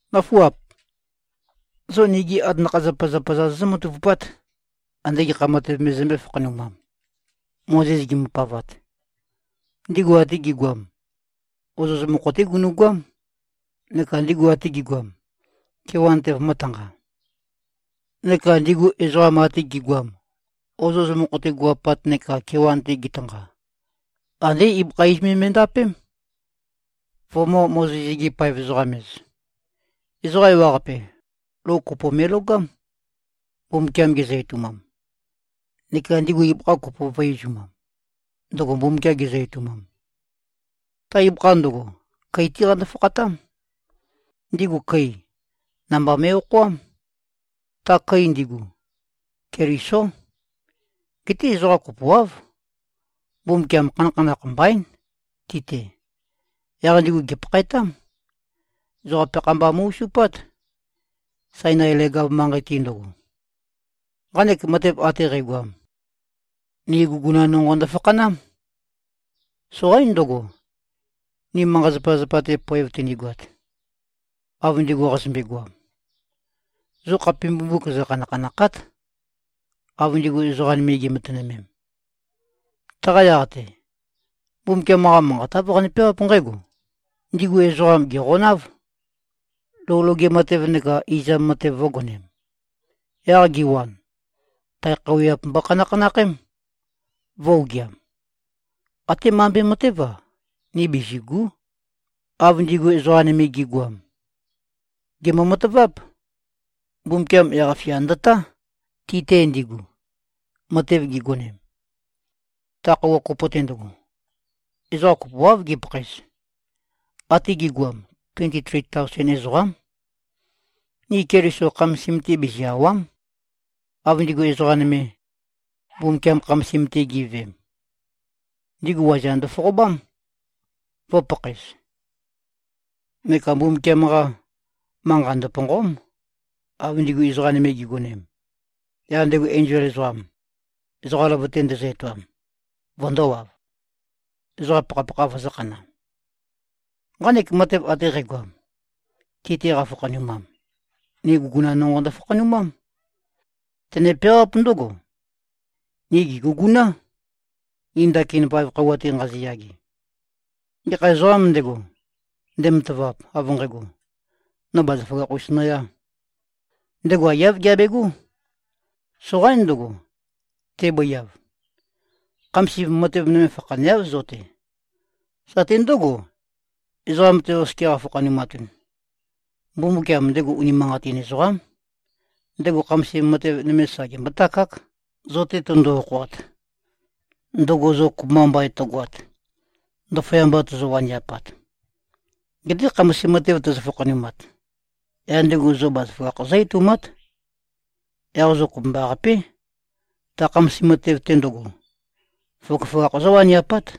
Nǿfuap! Zo nigi atanakha-zapazapa-za zozǿ-matavupát, ande gekha matev me zømbé-fakhanumam. Mozes gimbopavat, ndigu ate gi꞉goam, ozoz mokho-té gunu꞉goám, neka ndigu ate gi꞉goam, kewan-te vømø̄tanqa. Neka ndigu ezoqa ate gi꞉goam, ozoz mokho-te gu꞉-apat neka kewan-te gitanqa, andé ibøkha iz me me꞉ndapém, vømø̄-Mozes-gi-paev-ezoqam-ez. Ezoqa ewaqape, lou kopo me꞉logám, Mbumbukiam gezø-etoumam. Neka ndigu ibøkha kopo vø̄e-izumam, ndøgo Mbumbukiam gezø-etoumam. Ta ibøkha ndøgo, køi-té qando-fakhatám. Ndigu køi, namba me꞉-okhoám. Ta køi ndigu, Kelisó. Geté ezoqa kopoáv, Mbumbukiam khanakhanakh mbaín, ti-te. Yaq ndigu gèpakhaetám. Ezoqa peakha mba mu꞉-osupát, Sainai leg-av manqei-te ndøgo. Nqanek matev ate qægoam, ni guguna nonqo ndøfakhanám. Soqaín ndøgo, ni manqa-zapazapa-te poev tønigoat, av ndigu qazømbe-goam. Zo khape mbumbuk zøkhanakhanàkha᷄t, av ndigu ezoqa nøme gi꞉matønømem. Taqa yaq-te, Mbumbukiam-qa Manqat, āv qane-peawáp nqǽgo, “Ndigu ezoqam gèqonáv, lou loge matev neka izam matev vø̄gonem. Yaq giwan, tae khøuwiap mbokhanakhanakhém, vø̄-ogiam.” Até mambe matév-a, ni bizìgu᷄, av ndigu ezoqa nøme gi꞉goam. Gèmbo-mataváp. Mbumbukiam yaq-fia ndøtá, ti-te ndigu, matev gigonem. Ta khøuwa kopo-te ndøgo, ezoqa kopoáv gipakhaez. Ate gi꞉goam, tuenti-tri taosen ezoqám. Ni Keliso khamasim-te bizi-àwa᷄m, av ndigu ezoqa nøme, Mbumbukiam khamasim-te gi꞉veem. Ndigu waza ndøfoqobám, vø̄pakhaez. Neka Mbumbukiam-qa, manqa ndøpònqo᷄m, av ndigu ezoqa nøme gi꞉gonem, yaq ndego enzol ezoqam, ezoqa løvøte ndezø-etoam, vøndōwav, ezoqa pakhapakha vøzø̄khana. Nqanek matev ate qægoam, ti-te qafakhanumam, ni guguna nonqo ndøfakhanumám. Tøne-peawáp ndǿgo: Ni gè꞉guguná, ni ndakin vaev khøuwa-te nqaziyage. Gekha ezoqām ndego, ndematavap, av nqægo, no bazaføgakh-us noyā, ndego aiyáv geabegó. Soqaín ndøgo, tebøiav. Khamasim matev nøme fakhaneáv, zo-te. Satø ndǿgo, ezoqam-te oskia qafakhanumatun. Mbumbukiam, ndego unimanqatin ezoqám. Ndego khamasim matev nøme sa gembótakák, zo-te tøndo-okhoat, ndøgo zo kopømba mbain tøgoat, ndaføyamba tozo-waniapat. Geté khamasim matev tøzø-fakhanumat, yaq ndego zo bazaføgakh zǿ-etoumát. Yaq zo kopømbaqapé, ta khamasim matev-te ndøgo, føgøføgakh zówaniapát.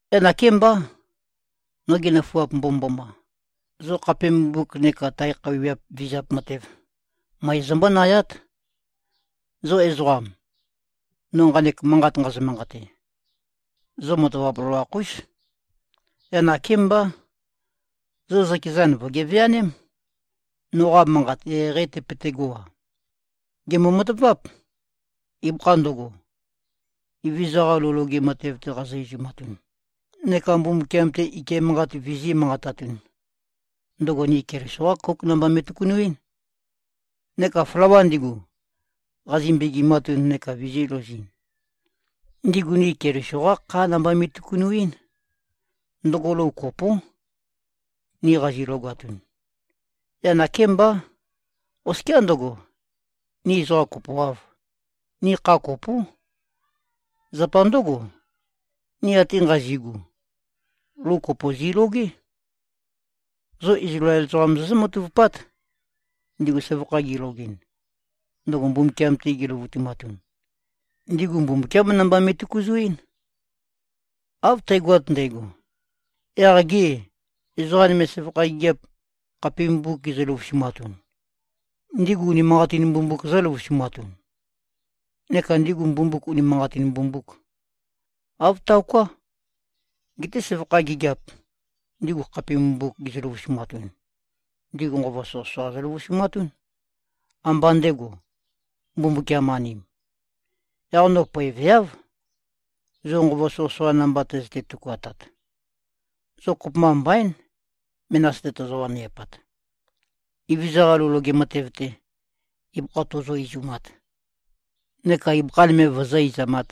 Yaq nakémbá, nogi nøfuap mbomømboma, zo khape mbumbuk neka tae khøuwiap vizap matev, møe zombónayát. Zo ezoqam, no nqanek manqat nqazø-manqate, zo matavap loloakh-ús. Yaq nakémbá, zo zøkezan vø̀geveaném, noqa manqat eqeieqeî tøpøtegó-a. Gèmbo-mataváp. Ibøkha ndøgo, Evezøza-qa lou loge matev-te qazi-izumatun neka Mbumbukiam-te ike manqat vizī꞉-manqatatun, ndøgo ni Keliso-qá kóuk namba me꞉tøkunuín. Neka flawa ndigu, qazi-mbegimatun neka vizīlouzɨn, ndigu ni Keliso-qá khá namba me꞉tøkunuín. Ndøgo lou kopó, ni qazi-logatun. Yaq nakémbá, oskiá ndøgo, ni ezoqa kopoāv, ni kha kopó. Zapa ndǿgo, ni ate nqazi꞉gu, lou kopo zi꞉logé. Zo Izlael ezoqam zozǿ-matavupát. Ndigu søvakha gilogɨn, ndøgo Mbumbukiam-te giløvutumatun, ndigu Mbumbukiám namba me꞉tøkuzuín. Av tægoat ndægo. Yaq gê, ezoqa nøme søvakha gigiap, khape mbumbuk gizø-løvusumatun, ndigu unimanqatin mbumbuk zø̄løvusumatun? Neka ndigu mbumbuk, unimanqatîn mbumbùk? Āv taoká! Geté søvakha gigiap, ndigu khape mbumbuk gizø-løvusumatun, ndigu nqova soqøsoqa zøløvusumatún, ambá ndego, Mbumbukiam-anim. Yaq no poeveáv, zo nqova soqøsoqa namba tøzøte-tøkuatat. Zo kopømba mbaín, menas-te tozo-waniapat, Evezøza-qa lou loge matev-te, ibøkha tozo-izumat, neka ibøkha nøme vozó-izamāt,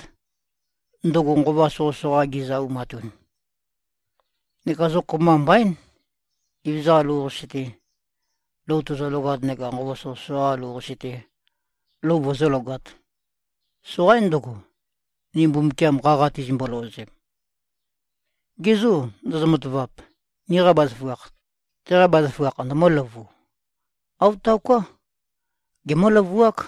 ndøgo nqova soqøsoqa gizø-aumatun. Neka zo kopømba mbaín, Evezøza-qa lou-qase-te, lou tozologat neka nqova soqøsoqa-qa lou-qase-te, lou vozólogāt. Soqaín ndøgo, ni Mbumbukiam qaqa tizimbo-løozem. Ge zô, ndozo-matavap, niqa bazaføgakh, teqa bazaføgakh ndømǿløvu? Āv taoká. Gemǿ-løvuák.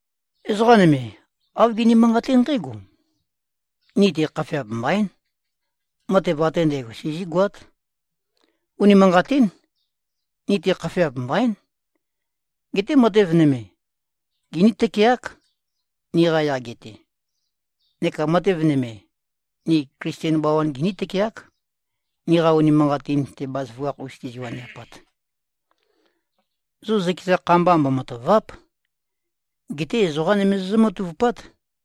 Ezoqa nøme, āv gini-manqaté nqǽgo, “Ni-te khafeap mbaín. Matev ate ndægo sizígoát.” Unimanqatín. Ni-te khafeap mbaín. Geté matev nøme, giní-tøkeák, niqa yage-te. Neka matev nøme, ni Klisten bawan giní-tøkeák, niqa unimanqatin-te bazaføgakh-us tizi-waniapat. Zo zøkeza kha mba mbomatàva᷄p. Geté ezoqa nøme zozǿ-matavupát.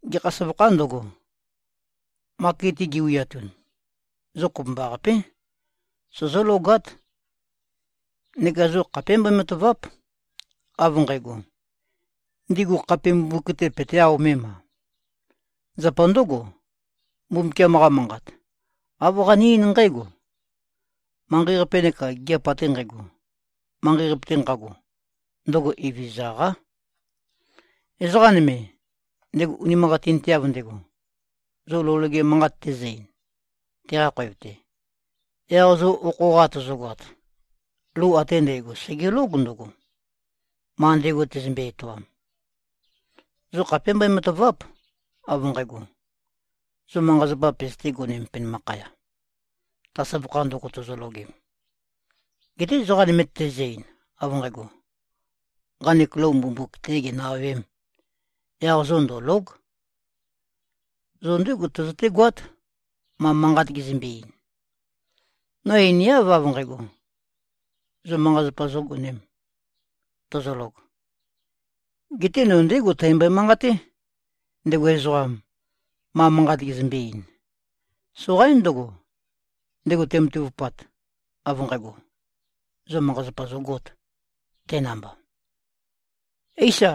Gekha søvakhā ndøgo, maket-te giwiatun, zo kopømbaqapé, sozólogát. Neka zo khapé mbøe-matàva᷄p, av nqægo, ndigu khape mbumbuk-te peté-aomem-a? Zapa ndǿgo, Mbumbukiam-qa Manqat, āv qane-eín nqǽgo, “Manqei-qape neka gigiap ate nqægo, manqei-qape-te nqago, ndøgo Evezøza-qá.” Ezoqa nøme, ndego unimanqatinteav ndego, zo lou loge manqat tezø-ein, teqa khoev-te, yaq zo okho-qa tozogoat, lou ate ndægo, sègelóg ndøgo, ma ndego tezømbe-etoam. Zo khapé mbøe-matàva᷄p, av nqægo, zo manqa-zapa pøzøté-gonēm penømakhaya, ta søvakha ndøgo tozologem. Geté ezoqa nøme tezø-ein, av nqægo, “Nqanek lou mbumbuk-tē ginø-awēm,” yaq zo ndø̀lo᷄g. Zo ndégo tøzøtégoát, ma manqat gezømbe-ein. No einiáv av nqægo, zo manqa-zapa zōgonēm, tozolog. Geté no ndégo tæmbøe-manqaté, ndego ezoqam, ma manqat gezømbe-ein. Soqaín ndøgo, ndego tematavupat, av nqægo, zo manqa-zapazapa zogōt, te namba. Éisa,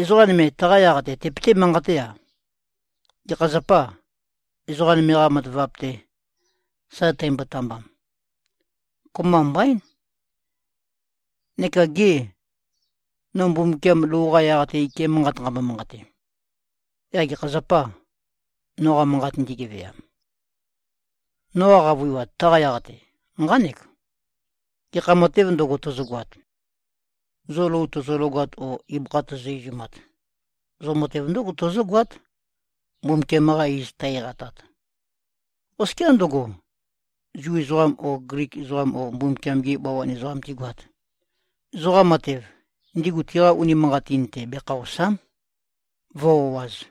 ezoqa nøme taqa yaq-te tepeté-manqate-a, “Gekha zapâ, ezoqa nøme-qa matavap-te, sa tæmbotambam? Kopømba mbaín. Neka gê, no Mbumbukiam lou-qa yaq-te ike manqat nqæmbo-manqate, yaq gekha zapâ, noqa manqa ndigeveam?” Noqa qavøiwat taqa yaq-te, nqánek: Gekha matēv ndøgo, tozogoat, zo lou tozologat o ibøkha tozo-izumat, zo matev ndǿgo tozógoát, Mbumbukiam-qa iz tæ-eqatat. Oskiá ndøgo, Zu ezoqam o Glik ezoqam o Mbumbukiam-gi bawan ezoqam tigoat, zoqa matev, ndigu tiqa unimanqatin-te bekhaòsa᷄m, vǿ-o꞉āz.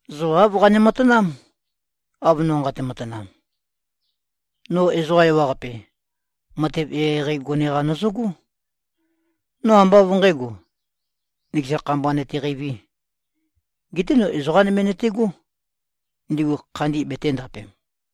Zo āv qane-matanám, av no nqate-matanam. No ezoqa ewaqape, matev eqeieqei gone-qa nøzøgó. No ambá av nqǣgo, nøkeza kha mba nøteqeivī. Geté no ezoqā nøme nøtegó, ndigu khandi betēndapem.